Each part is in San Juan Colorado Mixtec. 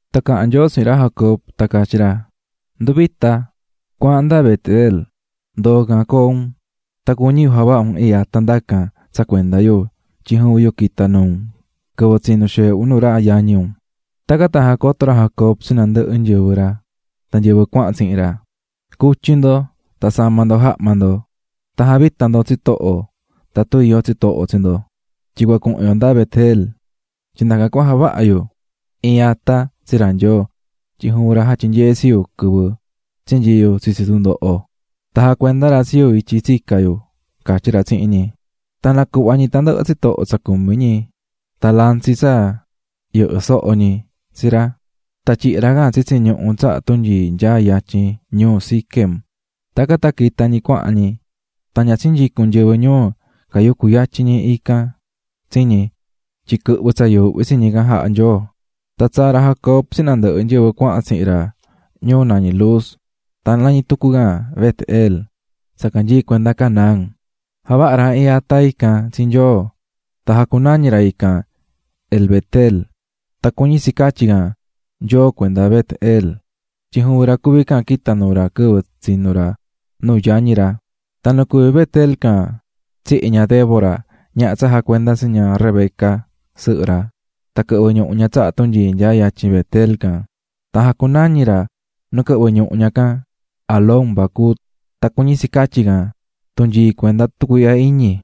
Tan caha̱n Nyoo tsihin ra Jacob tan catyí ra: "Ndu̱vita, cua̱ahan nda Bet-el, ndo̱o ndacan coo un, tan cuñí yu javaha un iin ata ndacan tsa cuenda yu tyin juvin yu quita̱ nuu un quɨvɨ tsinú xeehe un nuu ra yañi un." Tacan tan jacoto̱ ra Jacob tsi nandɨhɨ nyɨvɨ ra tan nyɨvɨ cuahan tsihin ra: --Cu̱tyi ndo tan sa̱ma ndo jahma ndo tan ja̱vita ndo tsitoho tatun iyó tsitoho tsi ndo. Tyin cua cuhun yo nda Bet-el, tyin ndacan cua javaha yu iin ata tsi ra Nyoo tyin juvin ra jatyinyee̱ tsi yu quɨvɨ tsinyii̱ yu tsitsi tundoho, tan jacuenda̱ ra tsi yu ityi tsica̱ yu --catyí ra tsihin ñi. Tan nacuhva̱ ñi tandɨhɨ tsitoho tsa cumí ñi tan lantsi tsa yɨhɨ́ soho ñi tsi ra, tan tyihi̱ ra can tsitsi ñuhu tsaha tunyii nyaá yatyin ñuu Siquem. Tacan tan quita̱ ñi cuahan ñi, tan ña tsinyicu̱n nyɨvɨ ñuu cayucú yatyin ñi can tsi ñi tyin quɨhvɨ̱ tsa yuuhvi tsi ñi can jaha̱ Nyoo. Tan tsaa̱ ra Jacob tsihin nandɨhɨ nyɨvɨ cuahan tsihin ra ñuu nañí Luz tan nañí tucu can Bet-el tsa canyií cuenda Canaán. Javaha̱ ra iin ata ican tsi Nyoo, tan jacunañi̱ ra ican El-betel tan cuñí tsi catyí can: Nyoo cuenda Bet-el, tyin juvin ra cuví can quita̱ nuu ra quɨvɨ tsinú ra nuu yañi ra. Tan nu cuví Bet-el can tsihi̱ ña Débora, ñaha tsa jacuenda̱ tsi ña Rebeca, sɨhɨ ra, tan quɨhvɨ̱ ñuhu ña tsaha tunyii nyaá yatyin Bet-el can, tan jacunañi̱ ra nu quɨhvɨ̱ ñuhu ña can Alón-bacut tan cuñí tsi catyí can "Tunyii cuenda tucuiihya iñi."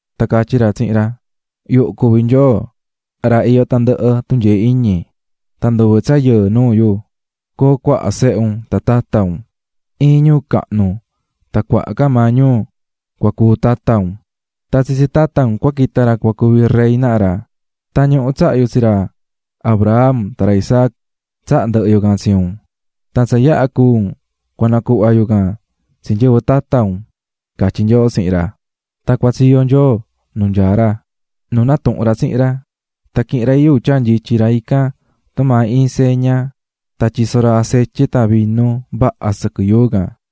Tan catyi̱ tucu ra tsihin ra tyehen: "Yuhu cuví Nyoo, ra iyó tandɨhɨ tunyee iñi, tan nduve tsa yɨɨ nuu yu, coo cuaha sehe un tan tata un; iin ñuu cahnu tan cuaha ca maa ñuu cua cuu tata un, tan tsitsi tata un cua quita ra cua cuvi rey naha ra. Tan ñuhu tsaha̱ yu tsi ra Abraham tan ra Isaac tsahá ndɨhɨ yu can tsi un, tan tsa yaha cúu un, cua nacuhva yu can tsi nyɨvɨ tata un", catyi̱ Nyoo tsihin ra quɨvɨ can. Tan cuatsiyo̱ Nyoo nuu nyaá ra, nu natuhu̱n ra tsihin ra. Tan quihi̱n ra iin yuu tyaa̱ nyityi ra ican tumaa iin tsa ndaa tan tyiso̱ ra acetye tan vinu vaha sɨquɨ yuu can.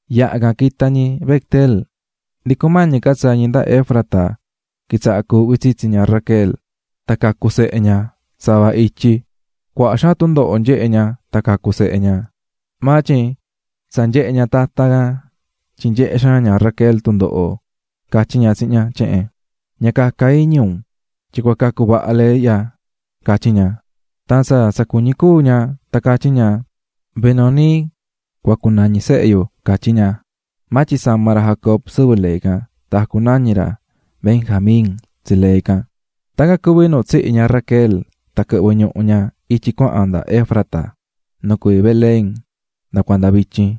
Yaha can, quita̱ ñi Bet-el, ndi cumañi ca tsaa ñi nda Efrata quitsaha̱ cuuhvi tsitsi ña Raquel tan cacu̱ sehe ña sava ityi. Cuaha xaan tundoho nyehe̱ ña tan cacu̱ sehe ña. Maa tyin tsa nyehe̱ ña tatan can tyin nyehé xaan ña Raquel tundoho catyí ña tsihin ña tyehen: "Ña caca iñi un tyin cua cacu vaha lee ihya", catyí ña. Tan tsa tsa cuñí cúu ña tan catyí ña: ―Benoni cua cunañi sehe yu --catyí ña. Maa tyin sama̱ ra Jacob sɨvɨ lee can tan jacunañi̱ ra Benjamín tsi lee can. Tacan cuví nu tsihi̱ ña Raquel tan quɨhvɨ̱ ñuhu ña ityi cuahan nda Efrata, nu cuví Belén nda cuanda vityin.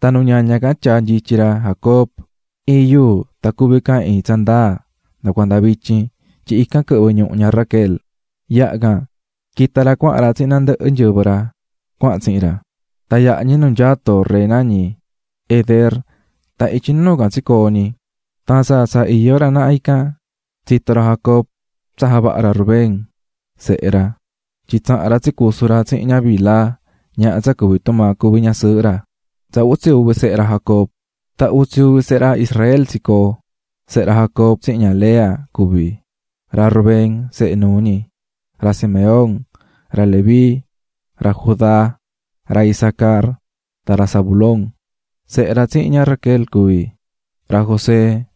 Tan nu ñaña can tyaa̱ nyityi ra Jacob iin yuu tan cuví can iin tsa ndaa nda cuanda vityin, tyin ican quɨhvɨ̱ ñuhu ña Raquel. Yaha can quita̱ ra cuahan ra tsihin nandɨhɨ nyɨvɨ ra cuahan tsihin ra, tan yaha̱ ñi nu nyaá torre nañí Eder, tan ityi nuu can tsicoo̱ ñi. Tan tsa tsa iyó ra naha can, tsito̱ ra Jacob tsa javaha̱ ra Rubén, sehe ra, tyin tsaha̱n ra tsicusu̱ ra tsihin ña Bilha, ñaha tsa cuví tumaa cuví ñasɨɨhɨ maa ra. Tsa utsi uvi sehe ra Jacob Tan utsi uvi sehe ra Israel tsicoo̱. Sehe ra Jacob tsihin ña Lea cuví: ra Rubén sehe nuu ñi, ra Simeón, ra Leví, ra Judá, ra Isacar tan ra Zabulón. Sehe ra tsihin ña Raquel cuví: ra José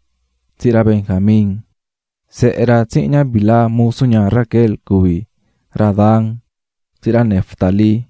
tsihin ra Benjamín. Sehe ra tsihin ña Bilha musu ña Raquel cuví: ra Dan tsihin ra Neftalí.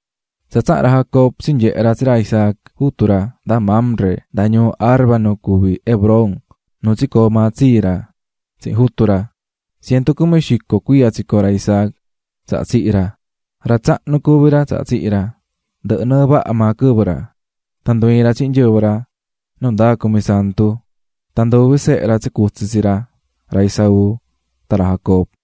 Tan tsaha̱n ra Jacob tsinyehe̱ ra tsi ra Isaac, jutu ra, nda Mamre, nda ñuu Arba nu cuví Hebrón, nu tsicoo̱ maa tsii ra tsihin jutu ra. Cientu cumi xico cuiya tsicoo̱ ra Isaac tsaha tsihi̱ ra. Ra tsahnu cuví ra tsaha tsihi̱ ra, ndɨhɨ̱ nɨɨ vaha maa quɨvɨ ra, tan ndu ii̱n ra tsihin nyɨvɨ ra nundaa cumisantu. Tan nduvi sehe ra tsicutsi̱ tsi ra, ra Esaú tan ra Jacob.